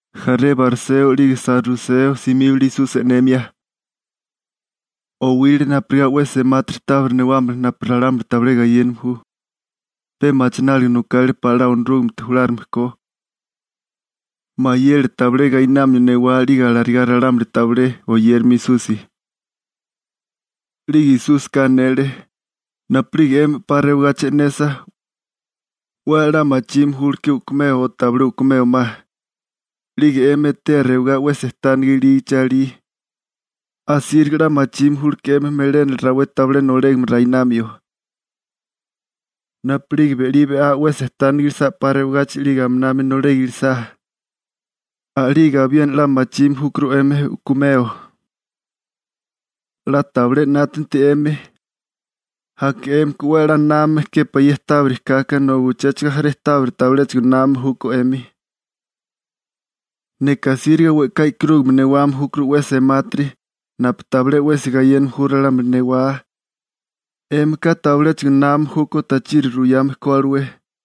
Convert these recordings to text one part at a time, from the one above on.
Jaré bariseo 'lige saruseo simíbale Esusi e'nemia. Owile napurigá 'we semátiri tábiri newámala napu ralámuli tabilé gayéname ju, pe machináliga nokale pa'lá Onorúgamete julárigame ko. Mayele tabilé gainamio newá 'lige alarigá ralámuli tabilé oyéramio Esusi. 'Lige Esúsika anele: ―Napu'lige 'emi 'pa rewagachi e'nesa, 'we a'lá machime júleké u'kumeo o tabilé u'kumeo ma. 'Lige 'emi etea rewigá 'we sejtániga ilígichi alí, asíriga 'la machime júlké 'emi melénala rawé tabilé nolégame rainamio. Napu'lige be'á be'lí 'we sejtániga ilisá 'pa rewagachi 'lige aminami nolega ilisá, a'lige abiena 'la machime júkuru 'emi u'kumeo. 'La tabilé 'nátanti 'emi, aka 'émika 'we a'lá námame képá ye tábiri kaka nobi uchéchigo jaré tábiri tabiléchigo námame júkó 'emi. Neka asíriga we'ká e'karúgame newame júkuru 'we semátiri napu tabilé 'wesi gayéname ju ralámuli newá, 'émika tabiléchigo námame júkó tachiri ruyame ko alué.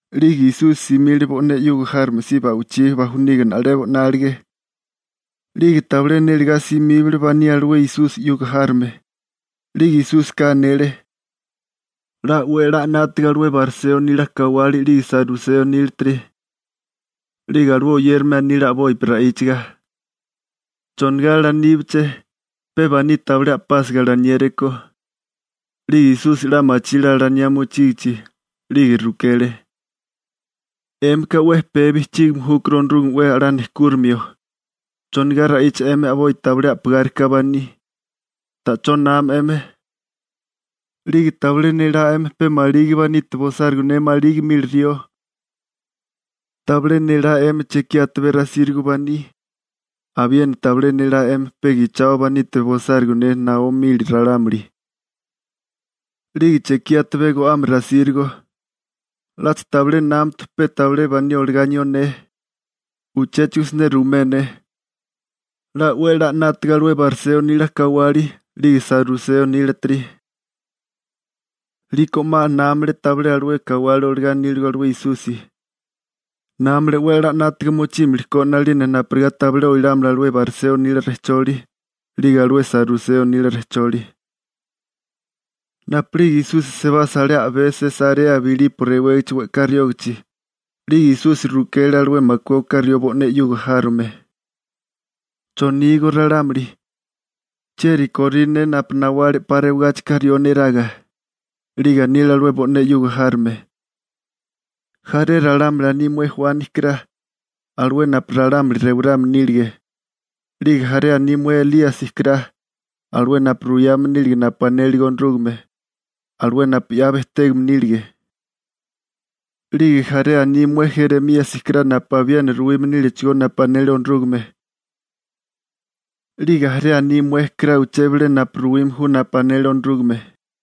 'Lige Esusi simile bo'né 'yuga járome si ba'wichí bajuniga na'lebo 'nálige, 'lige tabilé nélegá simíbale baní alué Esusi 'yuga járome. 'Lige Esúsika anele: ―'La 'we a'lá 'nátaga alué bariseo nila kawali 'lige saruseo nílatiri. 'Lige alué oyérame anile a'bopi ra'íchaga: ―¿Chonigá alaníbiché? ¿Pe baní tabilé a'pásiga alaniéréko? 'Lige Esusi 'la machile alaniá mochígichi, 'lige rukele: ―'Émika 'we pee bijchígime júkuru Onorúgame 'we a'lá nejkúrimio. ¿Chonigá ra'icha 'emi a'boi tabilé a'pigárika baní? ¿Ta'chó nama 'emi, 'lige tabilé nélá 'emi pe maligi banite bosárigo ne maligi mili rió? ¿Tabilé nélá 'emi chekí atabé rasírigo baní? ¿Abiena tabilé nélá 'emi pe gichao banite bosárigo ne naó mili ralámuli? ¿'Lige chekí atabé go'ame rasírigo? ¿'Lacha tabilé námatu pe tabilé baní olagá anió ne? Uchéchigo siné ruimé ne, 'la 'we 'la 'nátaga alué bariseo nila kawali, 'lige saruseo nílatiri. 'Liko 'ma námale tabilé alué kawali olagá aníligo alué Esusi, námale 'we a'lá 'nátaga mochímilikó 'nalina napurigá tabilé oilámala alué bariseo nile rejcholi, 'lige alué saruseo nila rejcholi. Napu'lige Esusi sebasa alé a'bé Sesarea Bilipo rewégichi we'ká riógachi, 'lige Esusi rukele alué makué oká rió bo'né 'yuga járome: ―¿Chonígó ralámuli, chieri korí ne napu nawale 'pa rewagáchika rió neraga? 'Lige anile alué bo'né 'yuga járome: ―Jaré ralámuli aní mué Juani kará, alué napu ralámuli rewarame nílige. 'Lige jaré aní mué Elíasi kará, alué napu ruyame nílige napu anélige Onorúgame, alué napu 'ya bejtégame nílige. 'Lige jaré aní mué Jeremíasi kará napu abiena ruwime nílechigó napu anele Onorúgame. 'Lige jaré aní mué kará uché bilé napu ruwime ju napu anele Onorúgame.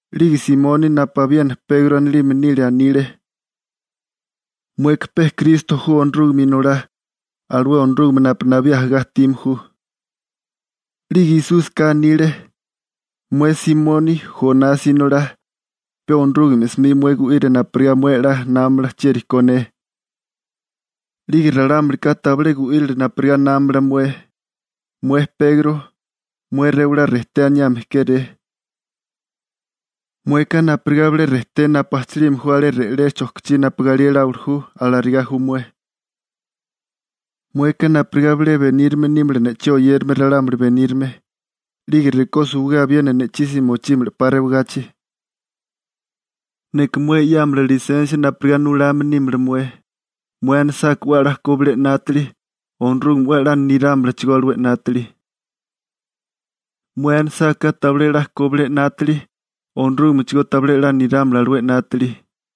'Lige Simoni napu abiena Pegro anilime nile anile: ―Mueka pe Kristo ju Onorúgame Inolá, alué Onorúgame napu nabí ajagá ajtime ju. 'Lige Esúsika anile: ―Mué Simoni, Jonasi inolá, pe Onorúgame 'smi mué gu'ira napurigá mué 'la námamala chieri ko ne, 'lige ralámulika tabilé gu'írile napurigá námamala mué. Mué Pegro, mué rewalá «rejté» aniame kéré. Mueka napurigá bilé rejté napu ajchilime ju alé re'lé chojkichí napu galí eláwili ju, alarigá ju mué. Mueka napurigá bilé benírame nímala ne'chí oyérame ralámuli benírame. 'Lige rekó suwigé abiena ne'chí si mochímala 'pa rewagachi. Neka mué 'yámala lisensia napurigá nulame nímala mué. Mué anisáká 'we a'lá ko bilé 'nátili, Onorúgame 'we a'lá nirámalachigó alué 'nátili. Mué anisáká tabilé 'la ko bilé 'nátili, Onorúgamechigó tabilé 'la nirámala alué 'nátili.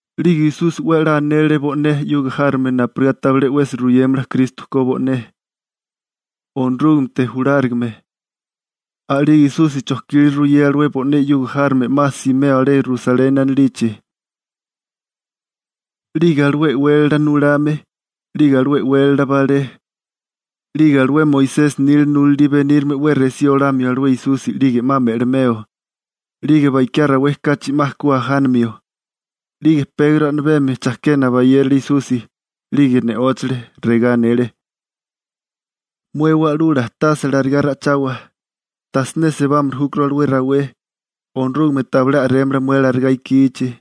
'Lige Esusi 'we a'lá anele bo'né 'yuga járome napurigá tabilé 'wesi ruyémala Kristo ko bo'né, Onorúgamete julárigame. A'lige Esusi chojkile ruyea alué bo'né 'yuga járome 'ma simeo alé Rusaleni anilichi. 'Lige alué e'wélala nulame, 'lige alué e'wélala balé, 'lige alué Moisesi nila nulalí benírame 'we resí olamio alué Esusi 'lige 'ma me'limeo, 'lige bakiá rawé kachi 'ma ku ajánimio. 'Lige Pegro a'mibemi chakena bayérale Esusi, 'lige ne'óchale, regá anele: ―¡Mué wa'lula tase alarigá ra'ichawa, tajsiné sebárimili júkuru alué rawé! ¡Onorúgame tabilé a'rémala mué alarigá ikichi!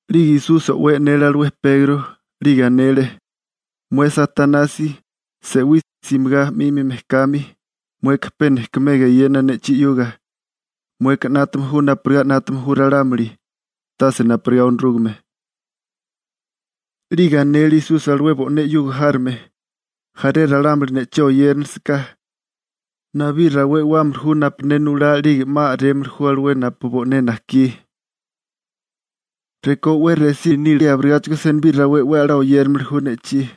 'Lige Esusi o'wé e'nele alué Pegro, 'lige anele: ―¡Mué Satanasi, se'wí, simigá 'mimi mejkami! Mueka pe nejkumega eyena ne'chí 'yuga. Mueka 'nátame ju napurigá 'nátame ju ralámuli, tase napurigá Onorúgame. 'Lige anele Esusi alué bo'né 'yuga járome: ―Jaré ralámuli ne'chí oyéranilisaká, nabí rawé e'wámili ju napu ne nulá 'lige 'ma a'rémili ju alué napu bo'né najkí. Rekó 'we resí nílie abirigáchigo senibí rawé 'we a'lá oyéramili ju ne'chí.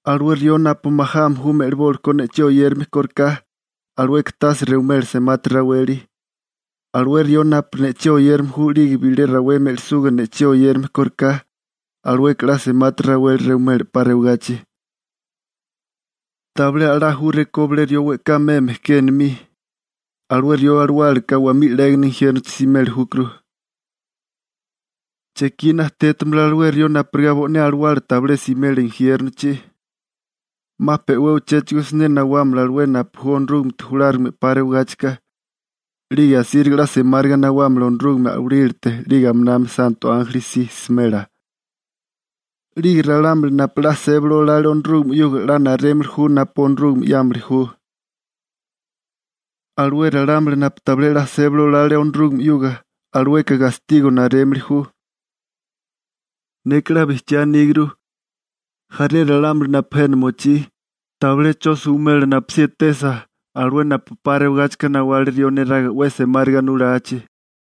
Alué rió napu majame ju me'libólikó ne'chí oyérame kóriká, alueka tase rewimela semati raweli. Alué rió napu ne'chí oyérame ju 'lige bilé rawé me'lisuga ne'chí oyérame kóriká, alueka 'la semati raweli rewimela 'pa rewagachi. Tabilé a'lá ju rekó bilé rió we'ká meme ke enomí, alué rió alawálaka wamí 'légana injiérnochi simeli júkuru. ¿Chekí najtétimala alué rió napurigá bo'né alawala tabilé simela injiérnochi? 'Ma pe'wé uchéchigo siné nawámala alué napu ju Onorúgamete julárigame 'pa rewigáchika, 'lige asíriga 'la semáriga nawámala Onorúgame a'walílate 'lige aminami santo ánjeli si smela, 'lige ralámuli napu 'la sébali olale Onorúgame 'yuga 'la narémili ju napu Onorúgame 'yámili ju. Alué ralámuli napu tabilé 'la sébali olale Onorúgame 'yuga, alueka gastigo narémili ju. Neka 'la bijchiá aníguru, jaré ralámuli napu jena mochí, tabilé 'cho suwimela napusí etesa alué napu 'pa rewagáchika nawale rió neraga 'we semáriga nulachi.